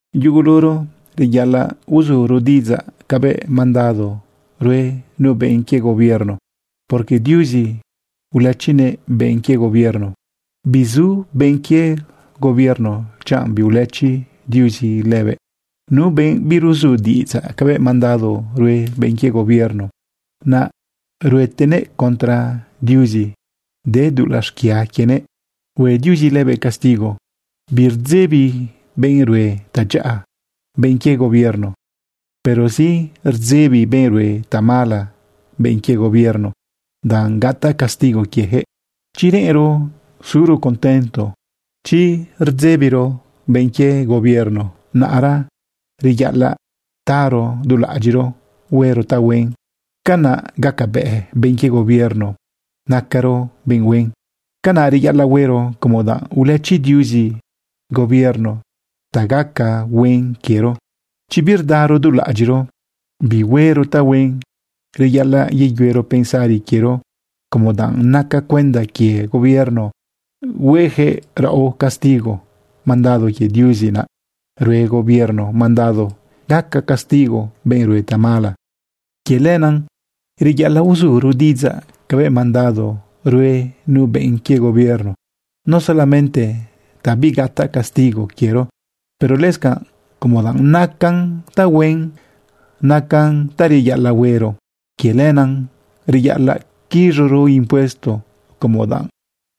Yuguluro reyaꞌalaꞌ uzuro diꞌidzaꞌ cabëꞌ mandado rue nu benꞌ quie gobierno, porque Diuzi ulëchinëꞌ benꞌ quie gobierno. Bizu benꞌ quie gobierno chanꞌ biulëchi Diuzi lëbëꞌ. Nu benꞌ biruzu diꞌidzaꞌ cabëꞌ mandado rue benꞌ quie gobierno, naꞌ ruetenëꞌ contra Diuzi, de dulaꞌ xquia quienëꞌ, hue Diuzi lëbëꞌ castigo. Birdzebi benꞌ rue tadyaꞌa benꞌ quie gobierno. Pero sí, rdzebi benꞌ rue tamala benꞌ quie gobierno danꞌ gataꞌ castigo quiejëꞌ. Chi reꞌenro suro contento, chi reꞌenro birdzebiro benꞌ quie gobierno, naꞌra reyaꞌalaꞌ taro dulaꞌadyiꞌro huero tahuen. Canaꞌ gacabëꞌ benꞌ quie gobierno nacaro benꞌ huen. Canaꞌ reyaꞌalaꞌ huero como danꞌ ulëchi Diuzi gobierno ta gaca huen quiero. Chi birdaro dulaꞌadyiꞌro bihuero tahuen, reyaꞌalaꞌ yeyuero pensari quiero como danꞌ naca cuenda quie gobierno huejëꞌ raꞌo castigo. Mandado quie Diuzi naꞌ rue gobierno mandado gaca castigo benꞌ rue tamala. Quie lenaꞌ reyaꞌalaꞌ uzuro diꞌidzaꞌ cabëꞌ mandado rue nu benꞌ quie gobierno, no solamente ta bigataꞌ castigo quiero, pero lëscanꞌ como danꞌ nacan tahuen, nacan ta reyaꞌalaꞌ huero. Quie lenaꞌ reyaꞌalaꞌ quiz̃uro impuesto como danꞌ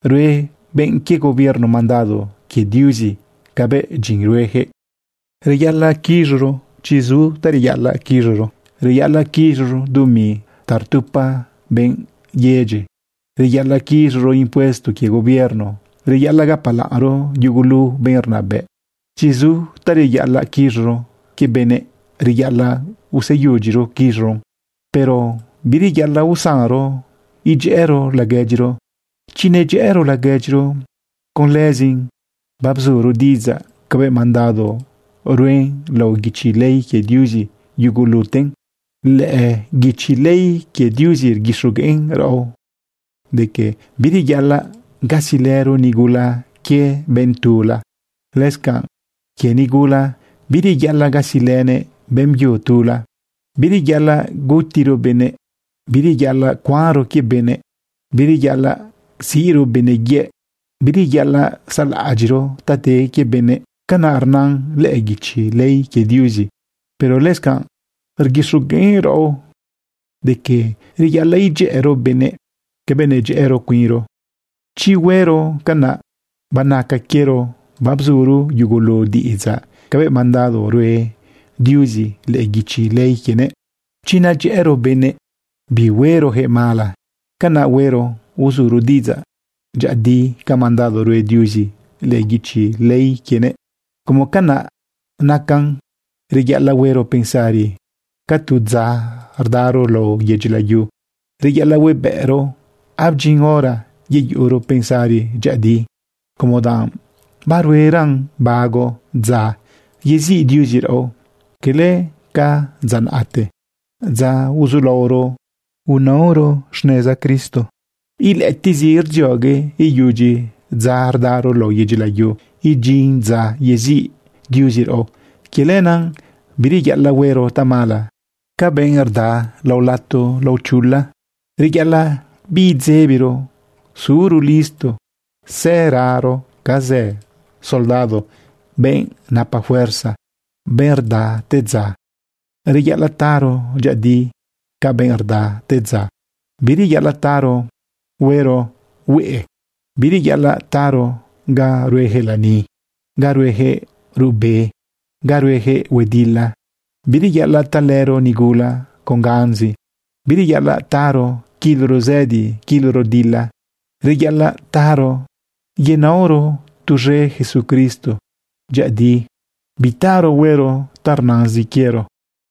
rue benꞌ quie gobierno mandado quie Diuzi cabëꞌ dyin ruejëꞌ. Reyaꞌalaꞌ quiz̃uro chi zu ta reyaꞌalaꞌquiz̃uro. Reyaꞌalaꞌ quiz̃uro dumi ta rtupa benꞌ yedyi. Reyaꞌalaꞌ quiz̃uro impuesto quie gobierno. Reyaꞌalaꞌ gapalaꞌnro yugulu benꞌ rnabëꞌ. Chi zu ta reyaꞌalaꞌ quiz̃uro quie benëꞌ, reyaꞌalaꞌ useyudyiro quiz̃uron. Pero bireyaꞌalaꞌ usanro idyëꞌëro laguedyiro. Chi nedyëꞌëro laguedyiro, con lëzin babzuro diꞌidzaꞌ cabëꞌ mandado rue lao guichi ley quie Diuzi yuguluten. Lëꞌë guichi ley quie Diuzi rguixogueꞌn raꞌo de que bireyaꞌalaꞌ gasilëro nigula quie benꞌ tula. Lëscanꞌ quie nigula, bireyaꞌalaꞌ gasilënëꞌ beꞌmbyu tula. Bireyaꞌalaꞌ gutiro benëꞌ, bireyaꞌalaꞌcuanro quie benëꞌ, bireyaꞌalaꞌ siꞌro benëꞌ yëꞌ, bireyaꞌalaꞌ saꞌlaꞌadyiꞌro ta de quie benëꞌ. Canaꞌ rnan lëꞌë guichi ley quie Diuzi. Pero lëscanꞌ rguixogueꞌn raꞌo de que reyaꞌalaꞌ idyëꞌëro benëꞌ cabëꞌ nadyëꞌëro cuinro. Chi huero canaꞌ, banaca quiero babzuro yugulu diꞌ idzaꞌ cabëꞌ mandado rue Diuzi lëꞌë guichi ley quienëꞌ. Chi nadyëꞌëro benëꞌ, bihuerojëꞌ mala. Canaꞌ huero uzuro diꞌidzaꞌ dyëꞌëdi ca mandado rue Diuzi lëꞌë guichi ley quienëꞌ. Como canaꞌ nacan, reyaꞌalaꞌ huero pensari ca tu dza rdaro lao yedyi layu. Reyaꞌalaꞌ huebëꞌro abdyin hora yeyuꞌuro pensari dyëꞌëdi, como danꞌ barueran bago dza yeziꞌ Diuzi raꞌo, cala ca dza naꞌte, dza uzulaoro inaoro xneza Cristo. Ilëꞌëtiꞌzi rdziogue iyudyi dza rdaro lao yedyi layu idyin dza yeziꞌ Diuzi raꞌo. Quie lenaꞌ bireyaꞌalaꞌ huero tamala ca benꞌ rda lao lato lao chula. Reyaꞌalaꞌ biidzebiro suro listo sëraro ca zë soldado, benꞌ napa fuerza, benꞌ rda te dza. Reyaꞌalaꞌ taro dyëꞌëdi ca benꞌ rda te dza. Bireyaꞌalaꞌ taro huero hueꞌe. Bireyaꞌalaꞌ taro ga ruejëꞌ lani, ga ruejëꞌ ruꞌbe, ga ruejëꞌ huedila. Bireyaꞌalaꞌ talëro nigula con ganzi. Bireyaꞌalaꞌ taro quiloro zëdi quiloro dila. Reyaꞌalaꞌ taro yenaoro tuz̃e Jesucristo dyëꞌëdi. Bitaro huero ta rnazin quiero.